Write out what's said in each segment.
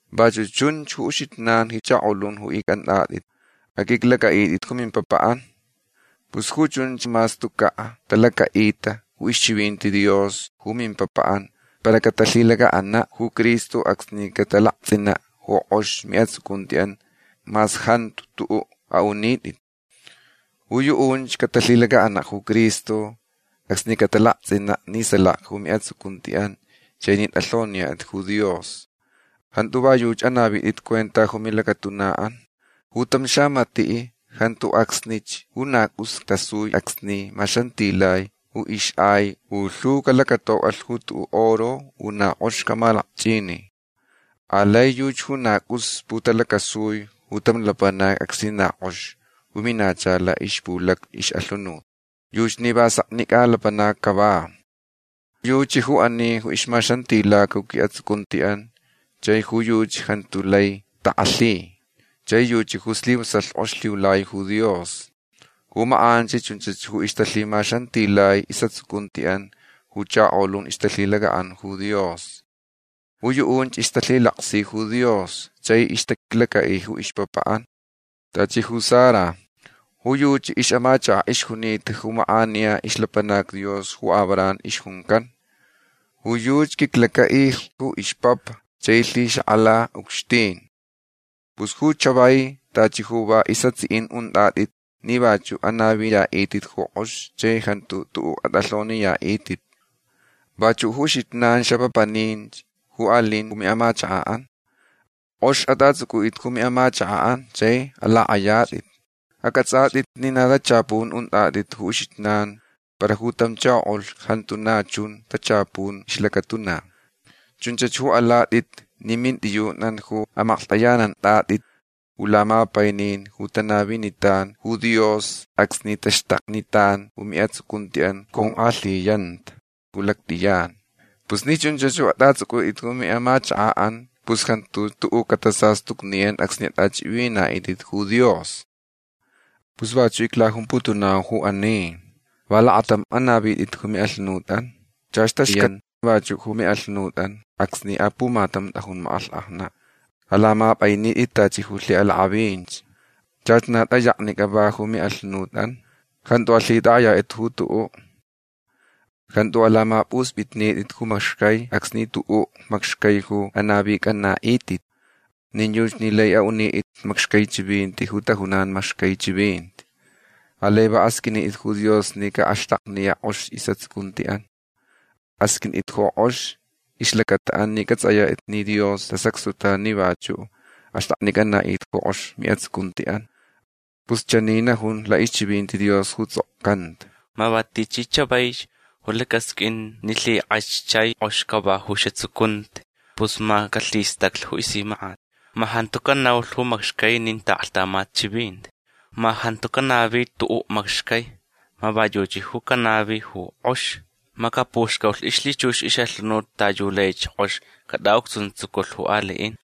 Vachuʼ chun ju uxijnan ji chakolun ju icʼantʼatʼit. Aqʼuiclacʼaʼitʼit ju mimpapaʼan. Pus ju chunch mas tucaʼ talacaʼita ju ixchivinti Dios ju mimpapaʼan para catalhilacaʼanaʼ ju Cristo acsni catalaktsʼinaʼ ju kʼox miʼatsucuntiʼan mas jantu tuʼuʼ aʼunitʼit. Ju yuʼunch catalhilacaʼanaʼ ju Cristo acsni catalaktsʼinaʼ ni salaka ju miʼatsucuntiʼan chai ni tʼalhoniyatʼit ju Dios. Jantu va yuchi ju anavitʼit cuenta ju milacatunaʼan. Ju tam xamatiʼ jantu acsnich ju na cʼus tasui acsni maxantilai ju ixʼai u lhu calacatocʼalh ju tuʼuʼ oro u na kʼox camalakchʼini. Alai yuchi ju na cʼus putalacasui ju tam lapanac acsni na kʼox ju minacha laʼixpulacni ixʼalhunut. Yuchi ni va seknicʼa lapanac cava. Yuchi ju ani ju ixmaxantilaca ju quiʼatsucuntiʼan chai ju yuchi jantu lai takʼalhi. Chai yuchi ju slivasalh kʼox lhiulai ju Dios. Ju makʼanch chunchach ju ixtalhimaxantilai isʼatsucuntiʼan ju chakolun ju ixtalhilacaʼanta ju Dios. Ju yuʼunch ixtalhilaksi ju Dios chai ixtaquiclacaʼi ju ixpapaʼan. Tachi ju Sara. Ju yuchi ixʼamachakaʼ ixjunita ju makʼaniya ixlapanac Dios ju Abraham ixjuncan. Ju yuchi quiclacaʼilh ju ixpapa chai lhixakʼalalh ucxtin. Pus ju chavai tachi ju va isʼatsiʼin untʼatʼit ni vachuʼ anaviyaʼitʼit ju kʼox chai jantu tuʼuʼ atʼalhoniyaʼitʼit. Vachuʼ ju uxijnan xapapaninch ju alin ju miʼamachakaʼan. Kʼox atʼatsʼucʼutʼit ju miʼamachakaʼan chai alakʼayatʼitch. Acʼatsʼatʼitch ni na tachapun untʼatʼit ju uxijnan para ju tam chakoʼulh jantu na chun tachapun ju ixlacatuna. Chunchach ju alatʼit ni mintʼiyunʼan ju amaklhtʼayanantʼatʼit ju lamapainin ju tanavinitan ju Dios acsni taxtaknitan ju miʼatsucuntiʼan ju conkʼalhiyanta ju lactʼiyan. Pus ni chunch ju atʼatsʼucʼutʼit ju miʼamachakaʼan pus jantu xtuʼuʼ catasastucniyan acsni atʼachʼivinaʼitʼit ju Dios. Pus vachuch iclajumputunau ju ani. Va lakatamch anavitʼit ju miʼalhunutʼan. Chach taxcaniyan vachuʼ ju miʼalhunutʼan acsni apumatam tʼajun makʼalhkʼajnaʼ. Alamapʼainitʼit tachi ju lhiʼalakʼavinch. Chach na tʼayeka va ju miʼalhunutʼan. Jantu alhitʼakʼayatʼit ju tuʼuʼ. Jantu alamapʼuspʼitnitʼit ju macxcai acsni tuʼuʼ macxcai ju anavicʼanaʼitʼit. Nin yuchi ni lai aʼunitʼit macxcai chivinti ju tajunan macxcai chivinti. Alai va asqʼuinitʼit ju Dios ni caʼaxtakniyaʼ kʼox isʼatsucuntiʼan. Asqʼuintʼit ju kʼox ixlacataʼan ni cʼatsʼayatʼit ni Dios tasacxtutan ni vachuʼ axtʼaknicʼanaʼitʼit ju kʼox miʼatsucuntiʼan. Pus chani najun laʼixchivinti Dios ju tsʼokcanta: Ma va tichi chavaich ju lacasqʼuin ni lhikʼach chai kʼox cava ju isʼatsucunti pus ma calhistaclh ju isimakʼat. Ma jantu canaulh ju macxcai nin taʼaklhtamat chivinti. Ma jantu canavi tuʼuʼ macxcai. Ma va yuchi ju canavi ju kʼox. Ma capuxcaulh ixlhichux ixʼalhunut ta yu laich kʼox catʼaʼucxuntsuculh ju aliʼin.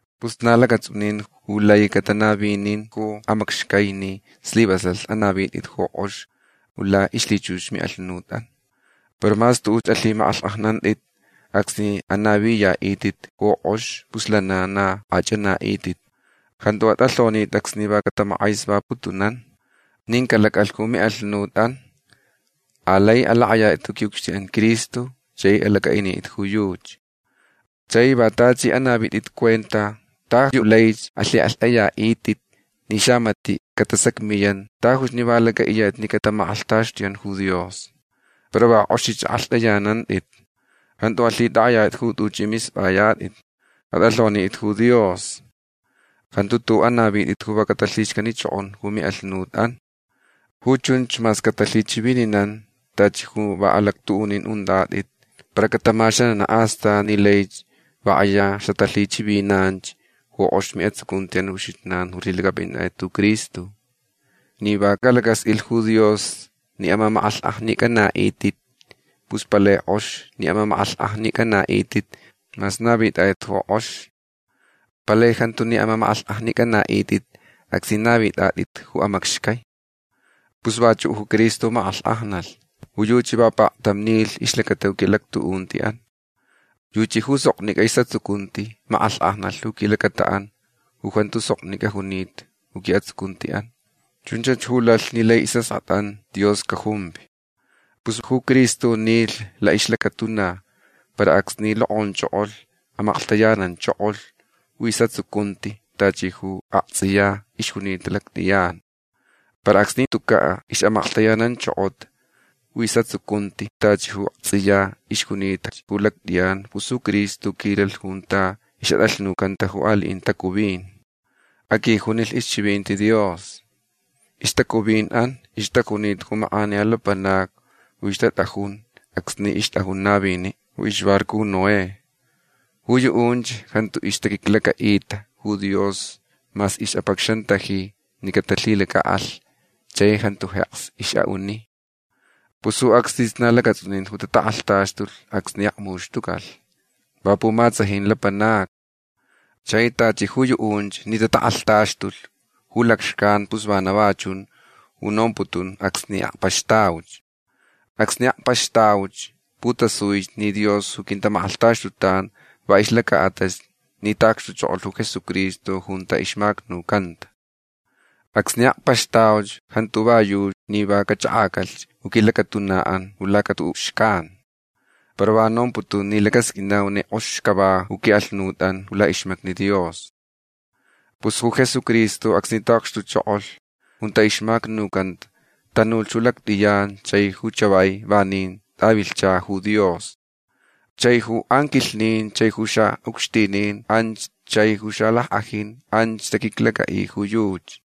Pus na lacatsʼunin ju lai catanavinin ju amacxcai ni slivasalh anavitʼit ju kʼox ju laʼixlhichux ju miʼalhunutʼan. Para mas tuʼuch alhimakʼalhkʼajnantʼit acsni anaviyaʼitʼit ju kʼox pus lana na akʼachʼanaʼitʼit. Jantu atʼalhonitʼit acsni va catamakʼesvaputunan. Nin calacʼalh ju miʼalhunutʼan. Alai alakʼayatʼit ju quiʼucxtinʼan Cristo chai alacʼaʼinitʼit ju yuchi. Chai va tachi anavitʼit cuenta ta yu laich alhikʼalhtʼayaʼitʼit ni xamatiʼ catasacmiyan tajuch ni va lacʼaʼiyatʼit ni catamakʼalhtaxtuyan ju Dios. Para va kʼoxich akʼalhtʼayanantʼit. Jantu alhitʼakʼayatʼit ju tuchʼi mispʼayatʼit. Atʼalhonitʼit ju Dios. Jantu tuʼuʼ anavitʼit ju va catalhixcanichokon ju miʼalhunutʼan. Ju chunch mas catalhichivininan tachi ju va alactuʼunin untʼatʼit para catamaxananach astan ni laich va kʼaya xatalhichivinanch ju kʼox miʼatsucuntiʼan ju uxijnan ju lhilacʼapʼinatʼit ju Cristo. Ni va calacasqʼuilh ju Dios ni amamakʼalhkʼajnicʼanaʼitʼit pus palai kʼox ni amamakʼalhkʼajnicʼanaʼitʼit mas navitʼatʼit ju kʼox. Palai jantu ni amamakʼalhkʼajnicʼanaʼitʼit acsni navitʼatʼit ju amacxcai. Pus vachuʼ ju Cristo makʼalhkʼajnalh. Ju yuchi va paktam nilh ixlacata ju quiʼalactuʼuntiʼan. Yuchi ju soknicʼa isʼatsucunti makʼalhkʼajnalh ju quilacataʼan ju jantu soknicʼa junita ju quiʼatsucuntiʼan. Chunch ju lalh ni lai isʼaskʼatʼan Dios cajumvi. Pus ju Cristo nilh laʼixlacatuna para acsni lokʼonchokolh amaklhtayananchokolh ju isʼatsucunti tachi ju aktsʼiya ixjunita ju lactʼiyan. Para acsni tucaʼ ixʼamaklhtayananchokota ju isʼatsucunti tachi ju aktsʼiya ixjunitach ju lactʼiyan pus ju Cristo quilalh junta ixʼatʼalhnucanta ju aliʼin tacuvin. Aquijunilh ixchivinti Dios. Ixtacuvinʼan ixtajunita ju makʼaniya lapanacni ju ixtatʼajun acsni ixtʼajun naviniʼ ju ixbarco ju Noé. Ju yuʼunch jantu ixtaquiclacaʼita ju Dios mas ixʼapacxantaji ni catalhilacaʼalh chai jantu jeks ixʼaʼuni. Pus ju acsnich na lacatsʼunin ju tatakʼalhtaxtulh acsni akmuxtucalh. Va pumatsajin lapanacni. Chai tachi ju yuʼunch ni tatakʼalhtaxtulh ju lacxcan pus vana va chun ju nomputun acsni akpaxtauch. Acsni akpaxtauch putasui ni Dios ju quintamakʼalhtaxtutanch va ixlacaʼatalh ni taʼacxtuchokolh ju Jesucristo junta ixmacnucanta. Acsni akpaxtauch jantu va yuʼ ni va cachʼakʼacalh ju quilacatunaʼan ju laca tuʼuʼ xcan. Para va nomputun ni lacasqʼuinauch ni kʼox cava ju quiʼalhunutʼan ju laʼixmacni Dios. Pus ju Jesucristo acsni taʼacxtuchokolh junta ixmacnucanta tanulh ju lactʼiyan chai ju chavai vanin tʼavilhcha ju Dios. Chai ju anquilhnin chai ju xaʼucxtinin anch chai ju xalackʼajinch anch taquiclacaʼi ju yuchi.